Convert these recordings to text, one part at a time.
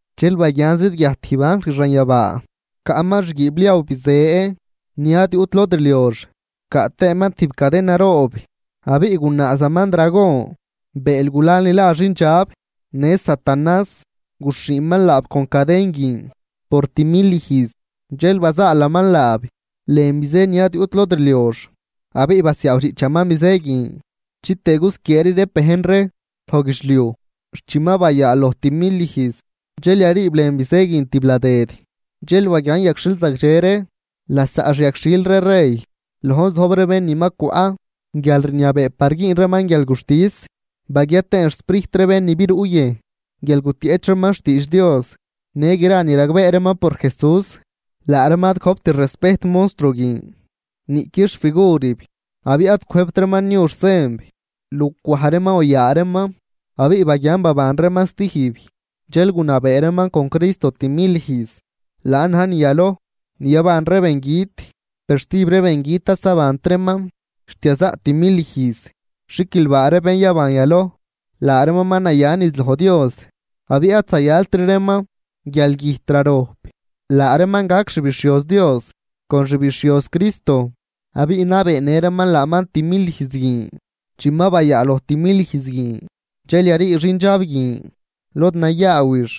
Dxel baguian zidguiajt tijb anjl xanyabaa, caꞌman xguiibliaw bizë ni ad yuꞌt lod rliox, caꞌ tëëman tijb caden naroob. Abiꞌ gunaazaman dragon, bëël gulal ni la xindxab në satanás, guxhiiman laab con caden guin por timil ijz. Dxel bazaalaman laab lën bizë ni ad yuꞌt lod rliox abiꞌ basiaawdxiꞌchaman bizë guin chitëë gusquieeri reeb bejn ree loj guidxliuj xt chi ma bayaaloj timil ijz dxel yariib lën bizë guin tibladëd. Dxel baguian yagxhil zagdxe ree lasaꞌ xyagxhil ree rey, lojn zojb ree bén ni ma cwaꞌ guialrniabee par güün reeman guialguxtis. Baguia tëën xsprijt ree bén ni biruꞌ yëjn guial gutieꞌch reeman xtiidx Dios në gra ni ragbee reeman por Jesús. Laa reeman ad gojpt respejt monstruo guin niꞌqui xfigurib abiꞌ ad cwëjbt reeman niu xsenb lucwaj reeman o yaa reeman. Abiꞌ baguian baban reeman stijb, dxel gunabee reeman con Cristo timil ijz. Laan na̱j ni yaloj ni yaban ree bengüt, per stijb ree bengüt ad zabant reeman xt yazaꞌ timil ijz. ¡Xiquilbaa ree bén yaban yaloj! Laa reeman ma naya niz loj Dios abiꞌ ad zayaltri reeman guialgüjt rarojp, laa reeman gac xbixhioz Dios con xbixhioz Cristo abiꞌ nabeenë reeman laaman timil ijz guin. Chi ma bayaaloj timil ijz guin, dxel yarii xindxab guin lod nayaawix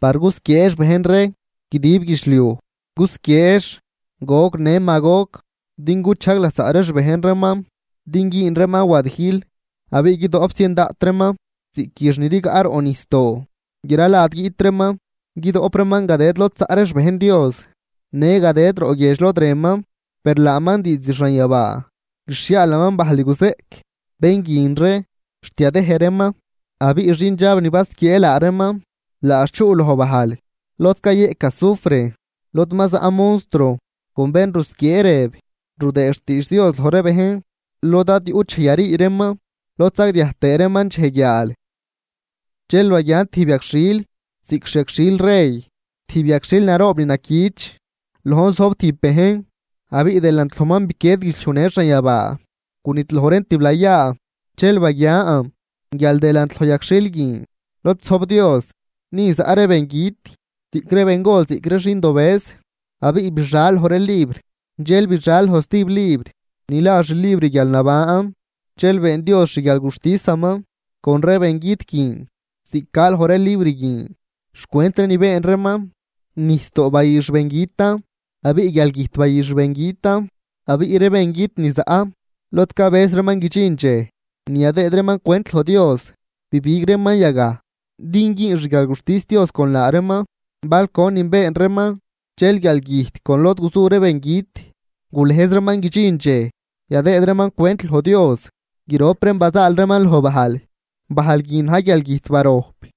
Par gusquieex bejn ree guidib guidxliuj. Gusquieex Gog në Magog din guchajg lasaꞌ ree xbejn reeman din güün reeman wadijl. Abiꞌ guidoꞌp zien daꞌt reeman ziꞌc üx ni rigaꞌ roꞌ nijsdoo. Gra lad guiꞌt reeman, guidoꞌp reeman gadëd lod zaꞌ ree xbejn Dios në gadëd roꞌ guiedx lod rënman. Per laaman diizd xanyabaa guixhiaalaman bajl ni guzeꞌc bén guin ree xt yadëj reeman. Abiꞌ xindxab ni basquiee laa reeman laax chuꞌ loj bajl lod cayeꞌc azufre, lod ma zaꞌ monstruo con bén rusquiee rëb rudëë xtiidx Dios loj ree bejn, lod ad yuꞌt dxej yarii reeman lod sagdiaj tëë reeman dxej guiaal. Dxel baguian tijb yagxhil ziꞌc xi yagxhil rey, tijb yagxhil naroob ni naquich. Lojn zojb tijb bejn abiꞌ delant lojman biquied guidxliuj në xanyabaa, gunidloj reen tiblayaa. Dxel baguian guial delant loj yagxhil guin lod zojb Dios, ni zaꞌ ree bengüt, ziꞌc ree bengol ziꞌc ree xindobëz. Abiꞌ bixal loj ree libr, dxel bixal loj stijb libr ni la xlibr guialnaban. Dxel been Dios xguialguxtisaman con ree bengüt guin ziꞌc ca loj ree libr guin xcwent ree ni been reeman. Nijsdoo bayü xbengütan, abiꞌ guialgüjt bayü xbengütan, abiꞌ ree bengüt ni zaꞌ lod cabëz reeman guidxin dxej ni yadëëd reeman cwent loj Dios, bibig reeman yagaj din güün xguialguxtis Dios con laa reeman bal conin been reeman. Dxel guialgüjt con lod guzu ree bengüt gulëjz reeman guidxin dxej yadëëd reeman cwent loj Dios, grop reen bazaal reeman loj bajl, bajl guin na̱j guialgüjt barojp.